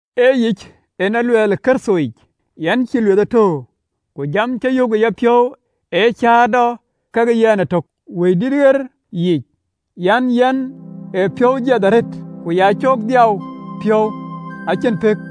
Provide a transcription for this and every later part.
Ee yic en luɛɛl në Kërthoyic, yɛn cïï lueth tör, ku jam cä yök ë yapiɔ̈u ee cäätɔ kekë yɛn ëtök ë Wëidït ɣer yiic an: Yɛn ë piɔ̈u jiɛth arëët ku ya coolë dhiau piɔ̈u acïn pëk.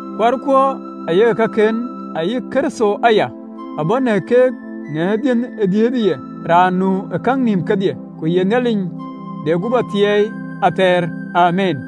kuarkuɔ ayek kaken, ayï Kërtho aya abɔ̈ në keek në dhiënh ë dhiëëthë ye, raan nu ë käŋ nïïm kedhie, ku ye Nhialic de guöp athiɛɛi athɛɛr. Amiin.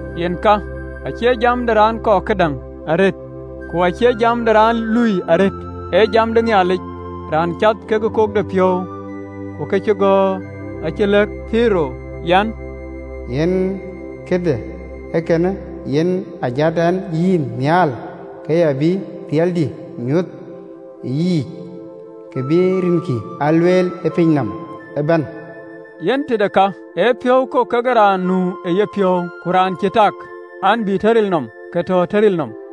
Yen ka, acie jam de raan kɔɔr këdäŋ arëët, ku acie jam de raan lui arëët, ee jam de Nhialic, Raan cath kekë kokdepiɔ̈u. (LXX). Ku këcïgɔ̈ɔ̈r acï lɛ̈k melik an, “Yen këde ee kënë yen aa jat ɛn yïn nhial, ke ya bï riɛldï nyuɔɔth ë yïyic, ku bï rinkï aa lueel ë piny nɔm ëbɛ̈n.” Yen tëde ka, ee piɔ̈u kok kekë raan nu ë yepiɔ̈u, ku raan cï tak an, bï tɔ ril nɔm, ke tɔ ril nɔm.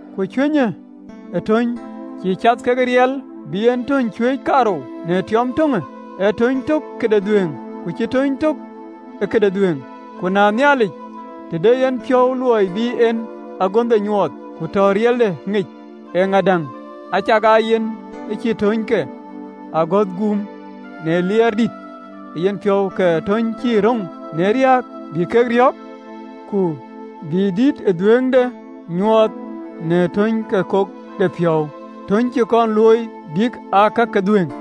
Ku cuëny ë töny, cïï cath ke riɛl bï en töny cuëëc kaarou në tiɔɔm töŋë, ee tööny tök këde dhuëëŋ, ku cïï tööny tök ee këde dhuëëŋ? Ku na Nhialic, të de yen piɔ̈u luɔi bï en agönhde nyuɔɔth, ku tɔ riɛlde ŋic, eeŋö däŋ, acakaa yen ë cï töny ke agɔ̈th guum në liɛɛr dïït ë yenpiɔ̈u, kek töny cï röŋ në riääk bï ke riɔ̈ɔ̈k, ku bï dït ë dhuëëŋde nyuɔɔth në töny ke kokdepiɔ̈u, töny cï kɔn looi, bïk aa ka ke dhuëëŋ,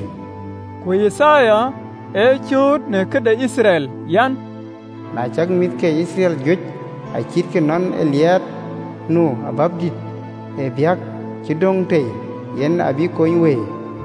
(LXX). Ku Yithaya ee cööt në këde Yithriɛl an, “Na cak mïth ke Yithriɛl juëc acïtkï nɔn ë liɛɛt nu wɛ̈ɛ̈r yɔu, ee kɔc lik cï döŋ tei, kek abï kony wëi.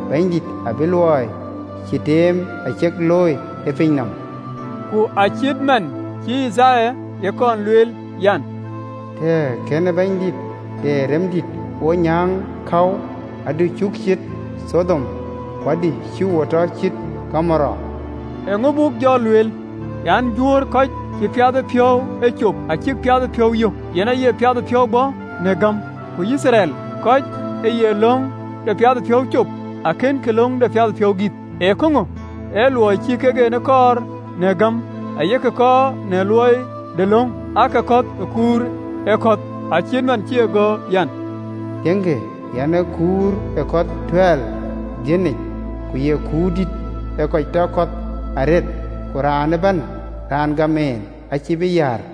Bɛ̈nydït abï luɔi cï teem acek thöl ë piny nɔm.” (LXX). Ku acït man cïï Yithaya ye kɔn lueel an, “Tëë Bɛ̈nydïït de Rɛm ë kën wo nyäŋ käu, adï cuk ciët Thɔdom, ku adï cï wo tɔ cït Gomoora.” Eeŋö buk jɔ lueel? An, Juöör, kɔc ë cïï piathëpiɔ̈u ee cop, acïk piathëpiɔ̈u yök, yen aye piathëpiɔ̈u bɔ̈ në gäm, ku Yithriɛl, kɔc ë ye löŋ dɛ piathëpiɔ̈u cop, akënkï löŋ de piathëpiɔ̈u gïth. Ee käŋö? Ee luɔi ë cïï kek en ee kɔɔr në gäm, aa yek kɔɔr në luɔi de löŋ. Aake kɔ̈th ë kuur ë kɔ̈th, (LXX). acït man cï e gɔ̈ɔ̈r an, “Tiëŋkï, yɛn ë kuur ë kɔ̈th tuɛɛl ë Dhiɔnic, ku ye kuur dïït ee kɔc tɔ kɔ̈th arëët, Ku raan ëbɛ̈n raan gam en, acïï bï yäär.”